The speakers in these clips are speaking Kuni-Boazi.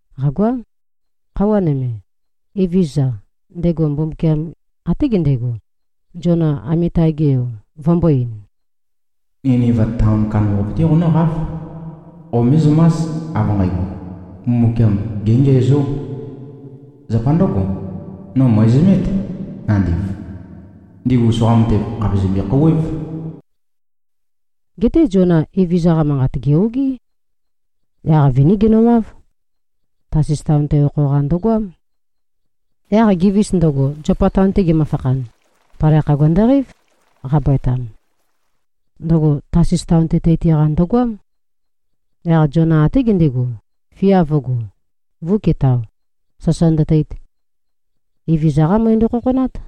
Qàgoám. Khøuwa nøme, Evezøza, ndego Mbumbukiam, até gendego, Ziona, Amitai-ge yo, vømbō-ein, “Niniva taon kandambaqape-té qonǿqáv. Qomézømás, av nqægo, Mbumbukiam géngiæzó. Zapa ndǿgo, no mø̀ezømét, nandiv. Ndigu soqa matev khàpe zømbe-khouwév.” Geté Ziona, Evezøza-qa manqat gè-ogí. Yaq viní genøwáv. Tasis taon-te okho-qa ndøgoám. Yaq gevis ndøgo, Ziopa taon-te gemøfakhan, palai khagua ndøqeív, qabøetam. Ndøgo Tasis taon-te teiti-qa ndøgoám. Yaq Ziona até gendego, fia vø̄go, vø̄uketao, sasa ndøteit. Evezøza-qá møe ndøkhokhonát.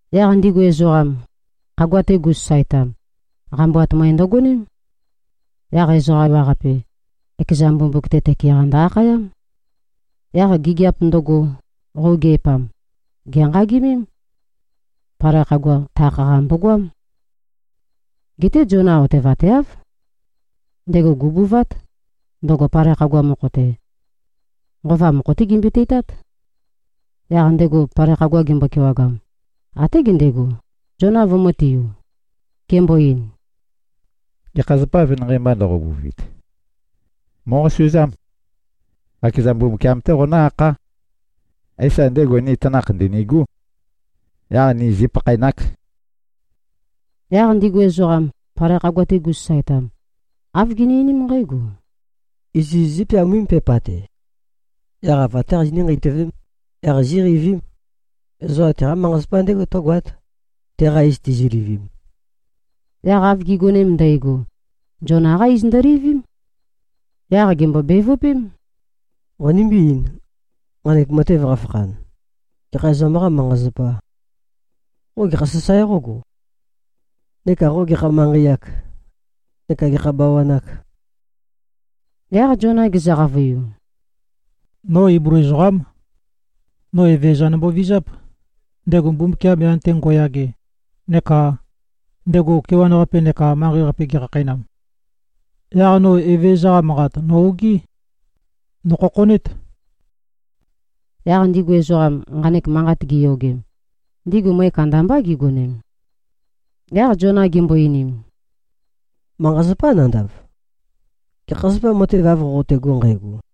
Yaq ndigu ezoqam, khagua-te gu꞉sasaetam, qambuat møe ndøgoném. Yaq ezoqa ewaqape, ekeza mbumbuk-te tøke-qa ndø-akhayám. Yaq gigiap ndøgo qøugeipam, gènqagemém. Palai khagua takh-qa mbogoám. Geté Ziona otevateáv. Ndego gù꞉buvát, ndøgo palai khagua mokho-te. Nqova mokho-té gembøi-teitát. Yaq ndego palai khagua gembo-kewagam, até gendego, Ziona vømø̄tiu. Gembo-ein, “Gekha zapâ, venanqei mba ndoqobuvit? Mòqosuzám. Qakeza Mbumbukiam-té qonǿ-akhá. Éisa, ndego ni tanakh ndø̀nigú. Yaq ni zípakhaenák.” Yaq ndigu ezoqam, palai khagua-te gu꞉sasaetam, āv gini-einím nqǽgo, “Iziz zípeawám, pepa-qasis-te. Yaq ava-té qazinǿ-nqeitøvém. Yaq zíqeivím. Ezoqam teqá manqa-zapa ndégo tǿgoát, teqa iz tizilivim.” Yaq av gi꞉gonem ndægo, Ziona-qá iz ndølivím. Yaq gèmbo-bevøpém, “Qonimbí-eīn. Nqanek matev qafakhan, gekha ezoqam-qâ manqa-zapà? Qo gekhā sasae qógo? Neka qo gekha manqei-âk? Neka gekha bawan-âk?” Yaq Ziona gezø-qavøiu, “No Iblu ezoqám. No Evezøza nombovizáp, ndego Mbumbukiam, yan-te ngo꞉yage neka ndego ndaola neka manqei-qape gekhakheinam. Yaq no Evezøza-qa manqat, nò-ogí. Nòkhokhonét.” Yaq ndigu ezoqam, nqanek manqat giyogem, ndigu møe kandambá gigonem. Yaq Ziona gimbo-einim, “Manqa-zapá nandav. Gekha zapâ, matev av qoqotego nqægo?”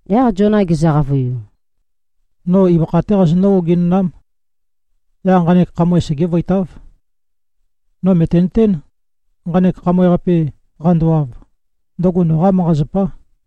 Yaq Ziona gezø-qavøiu, “No ibøkha-té qazonǿ-ogenønám. Yaq nqanek khamøe segévøitáv. No mø̀tenøtén, nqanek khamøe-qape qandowav, ndøgo noqá manqa-zapá.”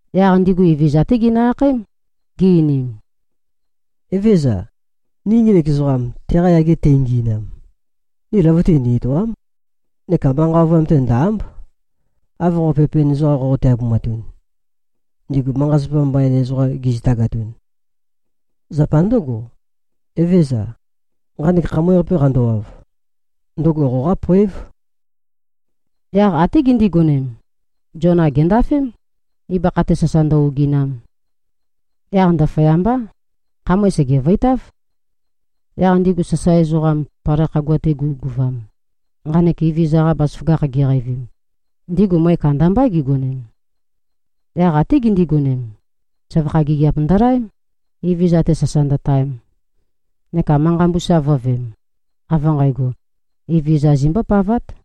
Yaq ndigu Evezøza-té ginø-akhaém, gi-einim, “Evézøza, ni ngenek ezoqam, teqa yage teingi꞉nam, ni løvøte ni-etòa᷄m neka manqa ovøyam-te ndò-a᷄mb, av qo pepen ezoqam qoqote-abumatun, ndigu manqa-zapa mbain ezoqam gizitagatun. Zapa ndǿgo, Evezøza, nqanek khamøe-qape qandowav, ndøgo qoqá poév.” Yaq até gindigonem, Ziona gèndafém, ibøkha-te sasa ndø-oginam. Yaq ndaføyambá, khamøe sègevøitáv. Yaq ndigu sasae ezoqam, palai khagua-te gu꞉guvam, nqanek Evezøza-qa bazaføgakh giqeivim, ndigu møe kandambá gigonem. Yaq até gindigonem, søvakha gigiap ndølaém, Evezøza-te sasa ndøtaem, neka manqa mbusa vø̄veem, av nqægo, Evezøza zimbōpavāt.